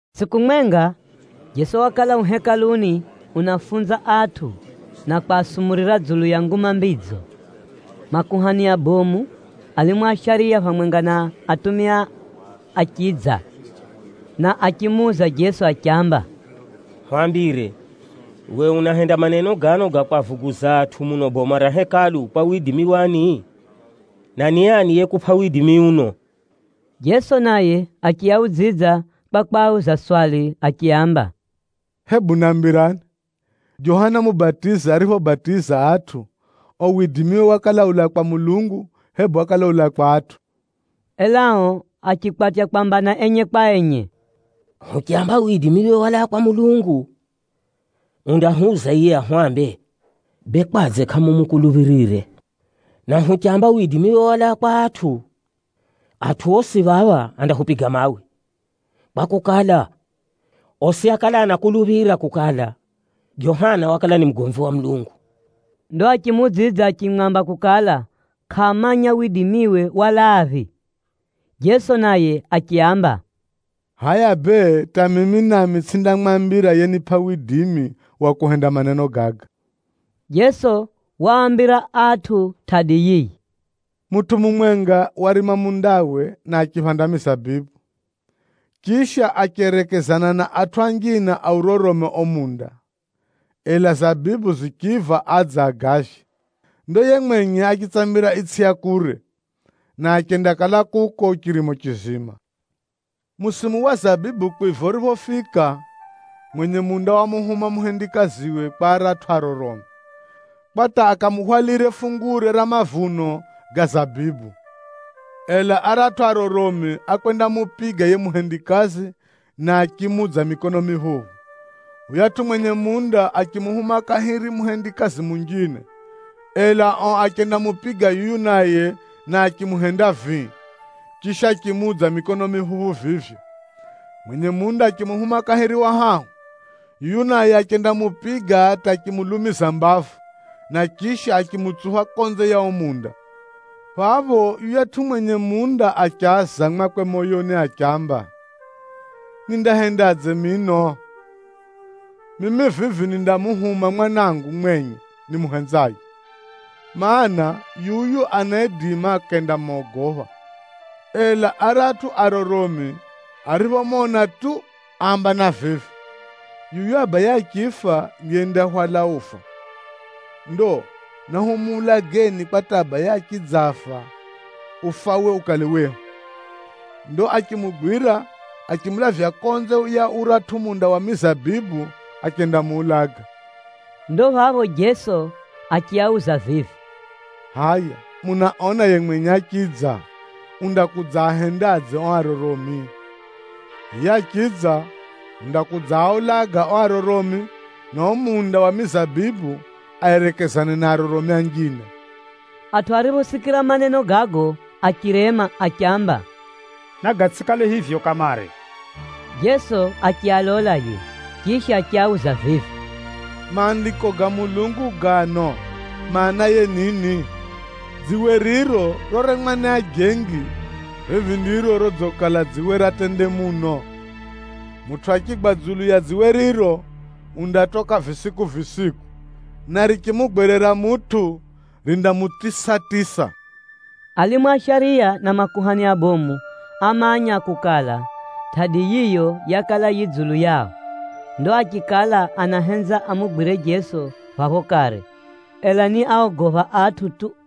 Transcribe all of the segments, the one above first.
Tsʼiku mwenga, Jeso wakala u Hekaluni unafunza atʼu na kwasumurira dzulu ya Nguma Mbidzo. Makuhani abomu, alimu a shariya phamwenga na atumia achidza, na achimuuza Jeso achiamba, “Hwambire, uwe unahenda maneno gano ga kwavuguza atʼu muno boma ra Hekalu kwa widimi wani? Na ni ani yekupʼa widimi uno?” Jeso naye achiaudzidza kwa kwauza swali achiaamba, “Hebu nambirani, Johana Mubatizi ariphobatiza atʼu, uo widimiwe wakala ulaa kwa Mulungu, hebu wakala ulaa kwa atʼu?” Ela ao achikwatya kwambana enye kwa enye: “Huchamba widimiwe walaa kwa Mulungu, undahwuza yiye ahwambe, ‘Bee kwadze kʼamumukuluphirire?’ Na huchamba widimiwe walaa kwa atʼu, atʼu osi phapha andahupiga mawe, kwakukala, osi ákala anakuluphira kukala, Johana wakala ni mugomvi wa Mulungu.” Ndo achimuudzidza achimwamba kukala kʼaamanya widimiwe walaaphi. Jeso naye achiaamba, “Hʼaya bee hata mimi nami tsʼindamwambira yenipʼa widimi wa kuhenda maneno gaga.” Jeso waambira atʼu tʼadi yiyi, “Mutʼu mumwenga warima mundawe na achiphanda mizabibu, chisha acherekezana na atʼu anjine aurorome uo munda, ela zabibu zichiiva adze agavye. Ndo yiye mwenye achitsamira itsʼi ya kure, na achendakala kuko chirimo chizima. Musimu wa zabibu kwiva uriphofika, mwenye munda wamuhuma muhendikaziwe kwa aratʼu aroromi, kwa hata akamuhwalire fungure ra mavuno ga zabibu. Ela aratʼu aroromi ákwendamupiga yiye muhendikazi, na achimuudza mikono miphuphu. Yuyatʼu mwenye munda achimuhuma kahiri muhendikazi munjine, ela ao achendamupiga yuyu naye na achimuhenda vii, chisha achimuudza mikono miphuphu vivyo. Mwenye munda achimuhuma kahiri wa hahu: yuyu naye achendamupiga hata achimulumiza mbavu, na chisha achimutsupha konze ya uo munda. Phapho yuyatʼu mwenye munda achaza mwakwe moyoni achiamba, ‘Nindahendadze mino? Mimi vivi nindamuhuma mwanangu mwenye nimuhenzaye, mana, yuyu anaidima akendamogopha.’ Ela aratʼu aroromi ariphomona tu áambana vivi, ‘Yuyu abaye achifa ndiye yendahwala ufa. Ndo nahumuulageni kwa hata abaye achidzafa, ufawe ukale wehu.’ Ndo achimugwira achimulavya konze ya uratʼu munda wa mizabibu achendamuulaga.” Ndo phapho Jeso achiuza vivi, “Hʼaya munaona yiye mwenye achidza, undakudzaahendadze ao aroromi? Yiye achidza, undakudzaaulaga ao aroromi, na uo munda wa mizabibu aerekezane na aroromi anjine.” Atʼu ariphosikira maneno gago achirema achiamba, “Nagatsʼikale hivyo kamare!” Jeso achialola yiye, chisha achiauza vivi, “Maandiko ga Mulungu gano, maanaye nini? ‘Dziwe riro roremwa ni ajengi, vivi ndiro rodzikala dziwe ra tende muno!’ “Mutʼu achigwa dzulu ya dziwe riro, undatoka visiku-visiku, na richimugwerera mutʼu, rindamutisatisa.” Alimu a shariya na makuhani abomu ámanya kukala, tʼadi yiyo yakala yi dzulu yao. Ndo achikala anahenza amugwire Jeso phapho kare, ela ni áogopha atʼu tu.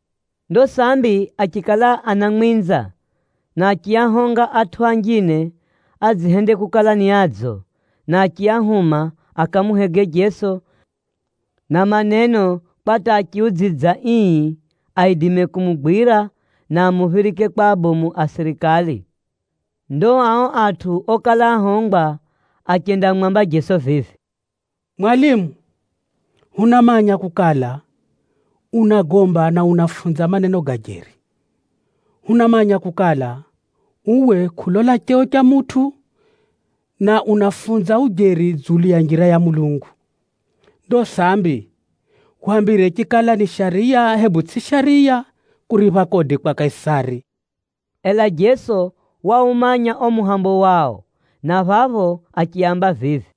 Ndo sambi achikala anamwinza, na achiahonga atʼu anjine adzihende kukala ni adzo, na achiahuma akamuhege Jeso na maneno kwa hata achiudzidza ii, aidime kumugwira na amuphirike kwa abomu a sirikali. Ndo ao atʼu okala áhongwa achendamwamba Jeso vivi, “Mwalimu, hunamanya kukala, unagomba na unafunza maneno ga jeri. Hunamanya kukala, uwe kʼulola cheo cha mutʼu, na unafunza ujeri dzulu ya njira ya Mulungu. Ndo sambi, hwambire chikala ni shariya hebu tsʼiyo shariya kuripha kodi kwa Kaisari!” Ela Jeso waumanya uo muhego wao, na phapho achiaamba vivi,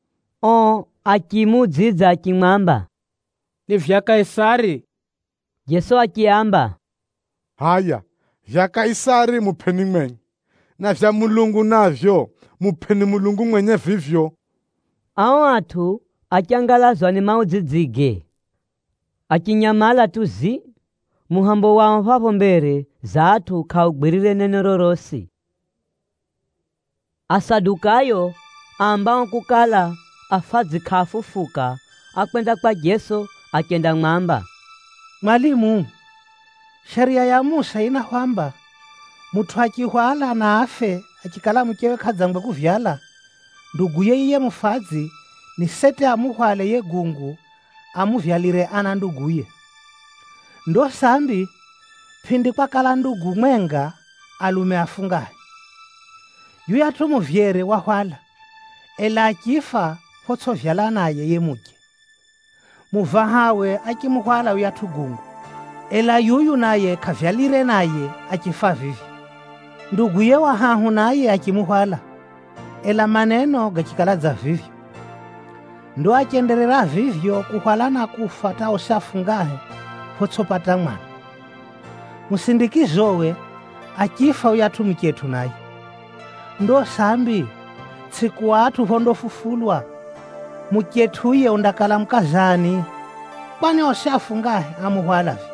Ao achimuudzidza achimwamba, “Ni vyakwe Kaisari.” Jeso achiaamba, “Hʼaya vyakwe Kaisari mupʼeni mwenye, na vyakwe Mulungu navyo, mupʼeni Mulungu mwenye vivyo.” Ao atʼu achangalazwa ni maudzidzige. Achinyamala tu zii. Muhambo wao phapho mbere za atʼu kʼaugwirire neno rorosi. Asadukayo aambao kukala, afadzi kʼaafufuka, ákwenda kwa Jeso achendamwamba, “Mwalimu, Shariya ya Musa yinahwamba, ‘Mutʼu achihwala na afe ariche muchewe kʼadzangwe kupata mwana, nduguye yiye mufadzi ni seti amuhwale yiye gungu amuvyalire ana nduguye.’ Ndo sambi, pʼindi kwakala ndugu mwenga, alume afungahe. Yuyatʼu muvyere wahwala, ela achifa photsʼivyala naye yiye muche. Muvahawe achimuhwala yuyatʼu gungu, ela yuyu naye kʼavyalire naye achifa vivyo. Nduguye wa hahu naye achimuhwala, ela maneno gachikala dza vivyo. Ndo achenderera vivyo kuhwala na kufa hata osi afungahe, photsʼipata mwana. Musindikizowe, achifa yuyatʼu muchetʼu naye. Ndo sambi, tsʼiku atʼu phondafufulwa, muchetʼu yiye undakala mukaza ani? Kwani osi afungahe ámuhwala vivyo.”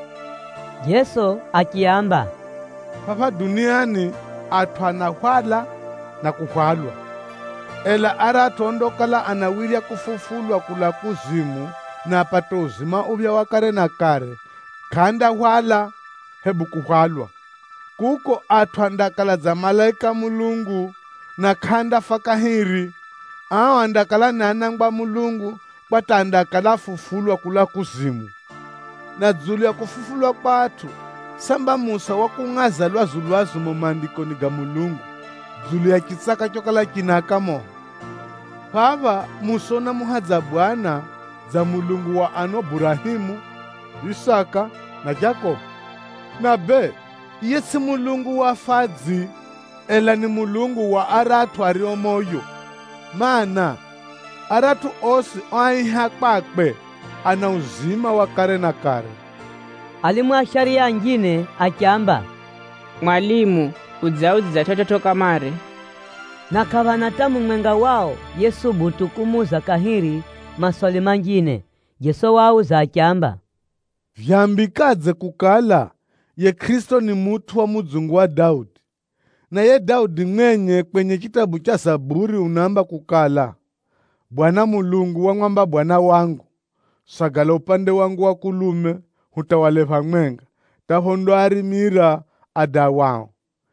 Jeso achiaamba, “Phapha duniani atʼu anahwala na kuhwalwa. Ela aratʼu ondakala anawirya kufufulwa kulaa kuzimu na apate uzima uphya wa kare na kare, kʼaandahwala hebu kuhwalwa. Kuko atʼu andakala dza malaika a Mulungu, na kʼaandafa kahiri. Ao andakala ni anangwa a Mulungu kwa hata andakala áfufulwa kulaa kuzimu. Na dzulu ya kufufulwa kwa atʼu, samba Musa wakungʼaza lwazu-lwazu mumo Maandikoni ga Mulungu dzulu ya chitsaka chokala chinaaka moho? Phapha Musa unamuhadza Mwenyezi Mulungu dza Mulungu wa ano Burahemu, Isaka na Jakobo. Na bee, yiye tsʼiye Mulungu wa afadzi, ela ni Mulungu wa aratʼu ario moyo, mana, aratʼu osi oaiha kwakwe ana uzima wa kare na kare.” Alimu a shariya anjine achiamba, “Mwalimu udziudzidza chividzo kamare.” Na kʼaphana hata mumwenga wao yesubutu kumuuza kahiri maswali manjine. Jeso waauza achiamba, “Vyambikadze kukala, yiye Kʼirisito ni mutʼu wa mudzungu wa Daudi, na yiye Daudi mwenye kwenye chitabu cha Zaburi unaamba kukala, ‘Bwana Mulungu wamwamba Bwana wangu, “Sagala upande wangu wa mukono wa kulume, hata phondakuhenda warime tsetsetse adawao”’?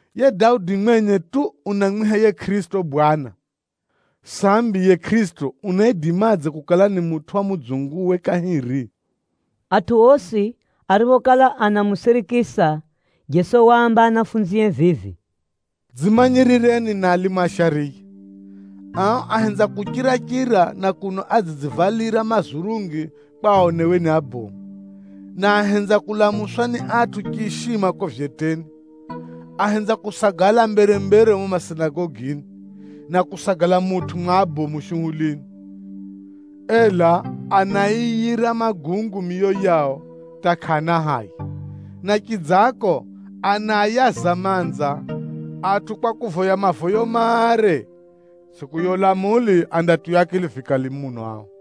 “Yiye Daudi mwenye tu, unamwiha yiye Kʼirisito ‘Bwana,’ sambi yiye Kʼirisito unaidimadze kukala ni mutʼu wa mudzunguwe kahiri?” Atʼu osi ariphokala anamusirikisa, Jeso waamba anafunzie vivi, “Dzimanyirireni na alimu a shariya. Ao ahenza kuchira-chira na kuno adzidzivalira mazurungi mare kwa aonewe ni abomu, na ahenza kulamuswa ni atʼu chiishima kuko vyeteni, ahenza kusagala mbere-mbere mumo masinagogini, na kusagala mutʼu mwa abomu shuhulini. Ela anaaiyira magungu miyo yao hata kʼaana haya, na chidzako, anaayaza manza atʼu kwa kuvoya mavoyo mare. Tsʼiku ya ulamuli andatiywa akili vikali muno atʼu dza ao!”